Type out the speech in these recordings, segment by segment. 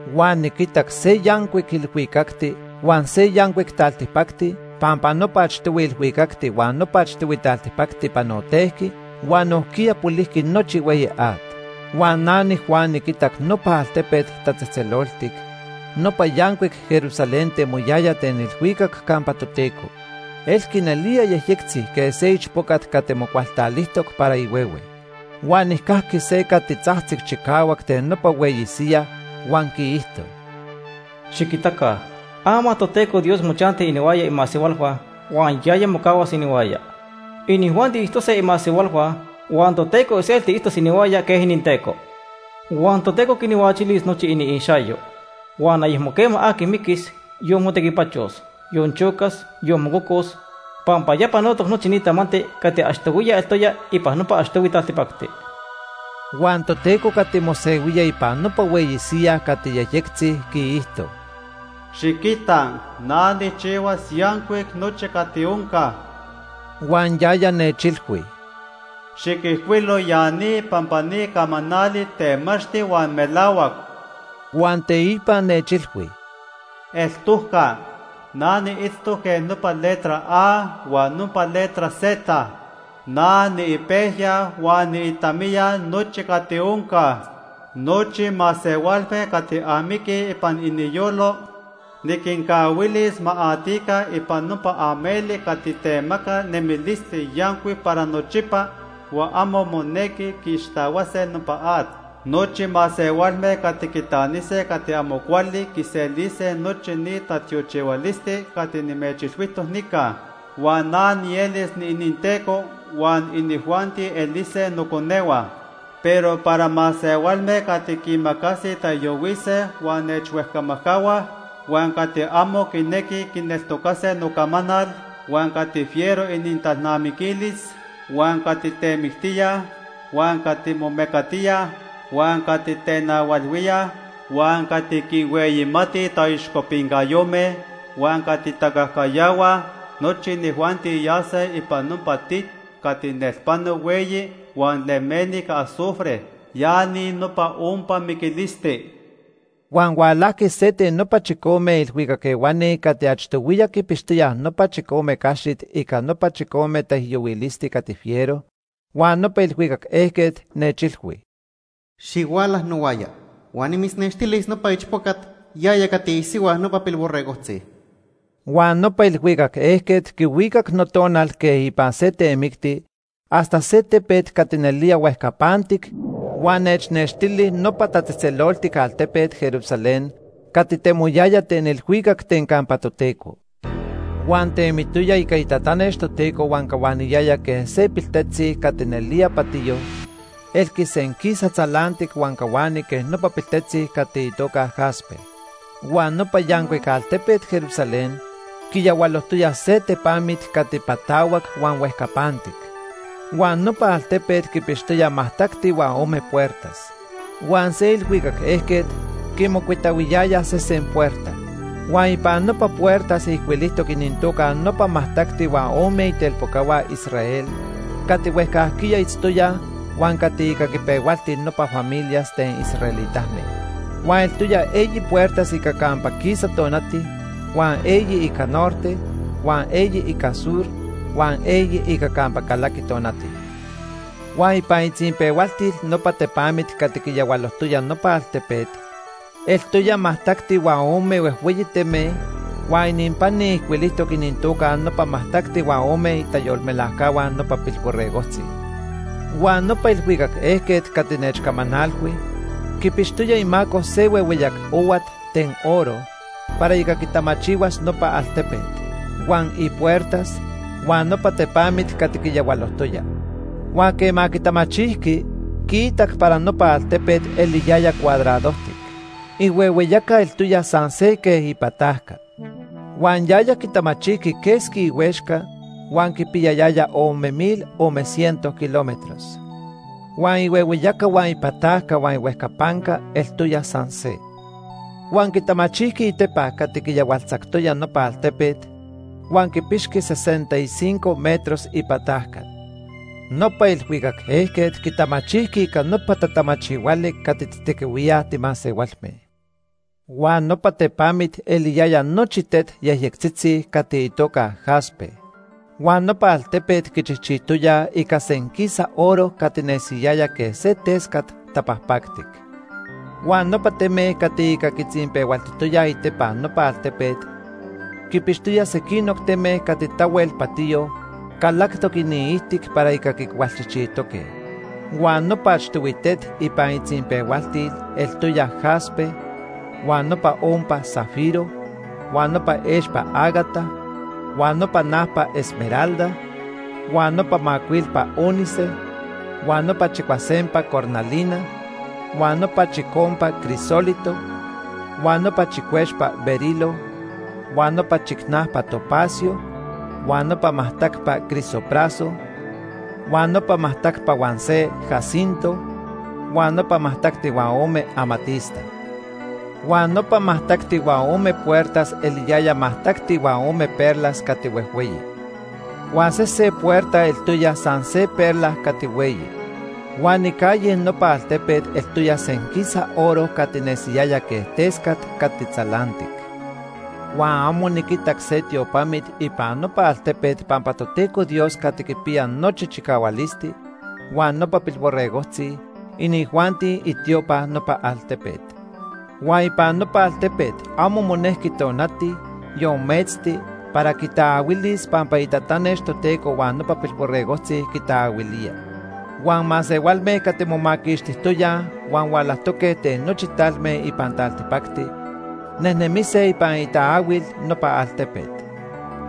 Huan niquitac se yancuic ilhuicacti huan se yancuic taltipacti pampa nopa achtohui ilhuicacti huan nopa achtohui taltipacti panotejqui huan nojquiya polijqui nochi hueyi at. Huan na niJuan niquitac nopa altepet tatzejtzeloltic, nopa yancuic Jerusalén temoyaya ten ilhuicac campa Toteco. Elqui nelía yejyectzi quej se ichpocat cati mocualtalijtoc para ihuehue. Huan nijcajqui se cati tzajtzic chicahuac ten nopa hueyi siyaj huan quiijto: “Xiquitaca ama Toteco Dios mochanti inihuaya imasehualhua huan yaya mocahuas inihuaya. Inijuanti itztose imasehualhua huan Toteco iselti itztos inihuaya quej ininTeco. Huan Toteco quinhuachilis nochi iniixayo. Huan ayecmo quema aqui miquis, yon motequipachos, yon chocas, yon mococos pampa ya panotoc nochi ni tamanti cati achtohuiya eltoya ipan nopa achtohui taltipacti.” Huan Toteco cati mosehuía ipan nopa hueyi siyaj cati yejyectzi quiijto: “Xiquita, na nijchihuas yancuic nochi cati onca.” Huan yaya nechilhui: “Xiquijcuilo ya ni pampa ni camanali temachti huan melahuac.” Huan teipa nechilhui: “Eltojca. Na niitztoc quej nopa letra A huan nopa letra Z. Na niipejya huan niitamiya nochi cati onca. Nochi masehualme cati amiquij ipan iniyolo, niquincahuilis ma atica ipan nopa ameli cati temaca nemilisti yancuic para nochipa huan amo monequi quiixtahuase nopa at. Nochi masehualme cati quitanise cati amo cuali quiselise nochi ni tatiochihualisti cati nimechilhuijtoc nica. Huan na nielis niininTeco, huan inijuanti elise noconehua. Pero para masehualme cati quiimacasij taijyohuise huan nechhuejcamajcahuaj, huan cati amo quinequij quineltocase nocamanal, huan cati fiero inintalnamiquilis, huan cati temictíaj, huan cati momecatíaj, huan cati tenahualhuíaj, huan cati quinhueyimatij taixcopincayome, huan cati tacajcayahuaj, nochi inijuanti yase ipan nopa tit cati nelpano hueyi huan lemeni ica azufre. Ya ni nopa ompa miquilisti.” Huan hualajqui se ten nopa chicome ilhuicac ehuani cati achtohuiya quipixtoyaj nopa chicome caxit ica nopa chicome taijyohuilisti cati fiero, huan nopa ilhuicac ejquet nechilhui: “Xihuala nohuaya huan nimitznextilis nopa ichpocat, yaya cati isihua nopa Pilborregojtzi.” Huan nopa ilhuicac ejquet quihuicac notonal quej ipan se temicti hasta se tepet cati nelía huejcapantic huan nechnextili nopa tatzejtzeloltic altepet, Jerusalén, cati temoyaya ten ilhuicac ten campa Toteco. Huan temitoya ica itatanex Toteco huan cahuaniyaya quej se piltetzi cati nelía patiyo; elqui senquisa tzalantic huan cahuani quej nopa piltetzi cati itoca jaspe. Huan nopa yancuic altepet Jerusalén quiyahualojtoya se tepamit cati patahuac huan huejcapantic. Huan nopa altepet quipixtoya majtacti huan ome puertas. Huan se ilhuicac ejquet quimocuitahuiyaya sesen puerta. Huan ipan nopa puertas ijcuilijtoc inintoca nopa majtacti huan ome itelpocahua Israel cati huejcajquiya itztoyaj huan cati ica quipehualti nopa familias ten israelitame. Huan eltoya eyi puertas ica campa quisa tonati, huan eyi ica norte, huan eyi ica sur, huan eyi ica campa calaqui tonati. Huan ipan itzinpehualtil nopa tepamit cati quiyahualojtoya nopa altepet eltoya majtacti huan ome huejhueyi teme huan ininpani ijcuilijtoc inintoca nopa majtacti huan ome itayolmelajcahua nopa Pilborregojtzi. Huan nopa ilhuicac ejquet cati nechcamanalhui quipixtoya imaco se huehueyac ohuat ten oro para ica quitamachihuas nopa altepet, huan ipuertas, huan nopa tepamit cati quiyahualojtoya. Huan quema quitamachijqui, quiitac para nopa altepet eliyaya cuadradojtic. Ihuehueyaca eltoya san se quej ipatajca. Huan yaya quitamachijqui quesqui ihuexca huan quipiyayaya ome mil ome ciento kilómetros. Huan ihuehueyaca huan ipatajca huan ihuejcapanca eltoya san se. Huan quitamachijqui itepa cati quiyahualtzactoya nopa altepet huan quipixqui sesenta y cinco metros ipatajca. Nopa ilhuicac ejquet quitamachijqui ica nopa tatamachihuali cati tijtequihuíaj timasehualme. Huan nopa tepamit eliyaya nochi tet yejyectzitzi cati itoca jaspe. Huan nopa altepet quichijchijtoya ica senquisa oro cati nesiyaya quej se tescat tapajpactic. Huan nopa teme cati ica quitzinpehualtijtoyaj itepa nopa altepet quipixtoya sequinoc teme cati tahuel patiyo calactoc iniijtic para ica quicualchijchijtoque. Huan nopa achtohui tet ipan itzinpehualtil eltoya jaspe, huan nopa ompa zafiro, huan nopa expa ágata, huan nopa najpa esmeralda, huan nopa macuilpa ónice, huan nopa chicuasempa cornalina, huan nopa chicompa crisólito, huan nopa chicuexpa berilo, huan nopa chicnajpa topacio, huan nopa majtacpa crisopraso, huan nopa majtacti huan se jacinto, huan nopa majtacti huan ome amatista. Huan nopa majtacti huan ome puertas eliyaya majtacti huan ome perlas cati huejhueyi. Huan sesen puerta eltoya san se perla cati hueyi. Huan icalle nopa altepet eltoya senquisa oro cati nesiyaya quej tescat cati tzalantic. Huan amo niquitac se tiopamit ipan nopa altepet pampa Toteco Dios Cati Quipiya Nochi Chicahualisti huan nopa Pilborregojtzi, inijuanti itiopa nopa altepet. Huan ipan nopa altepet amo monejqui tonati, yon metzti para quitaahuilis pampa inintatanex Toteco huan nopa Pilborregojtzi quitaahuilía. Huan masehualme cati momaquixtijtoyaj huan hualajtoque ten nochi talme ipan taltipacti nejnemise ipan itaahuil nopa altepet.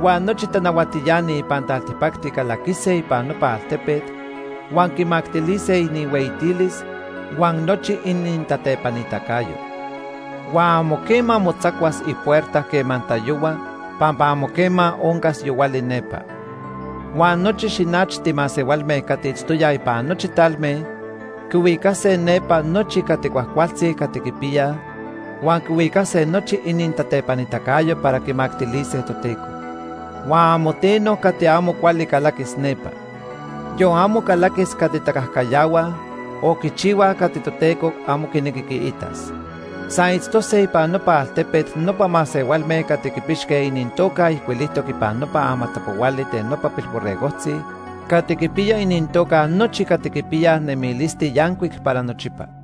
Huan nochi tanahuatiani ipan taltipacti calaquise ipan nopa altepet huan quimactilise inihueyitilis huan nochi inintatepanitacayo. Huan amo quema motzacuas ipuerta quema tayohua pampa amo quema oncas yohuali nepa. Huan nochi xinachti masehualme cati itztoyaj ipan nochi talme quihuicase nepa nochi cati cuajcualtzi cati quipiyaj, huan quihuicase nochi inintatepanitacayo para quimactilise Toteco. Huan amo teno cati amo cuali calaquis nepa. Yon amo calaquis cati tacajcayahuaj o quichihuaj cati Toteco amo quinequi quiitas. San itztose ipan nopa altepet nopa masehualme cati quipixque inintoca ijcuilijtoc ipan nopa amatapohuali ten nopa Pilborregojtzi cati quipiya inintoca nochi cati quipiyaj nemilisti yancuic para nochipa.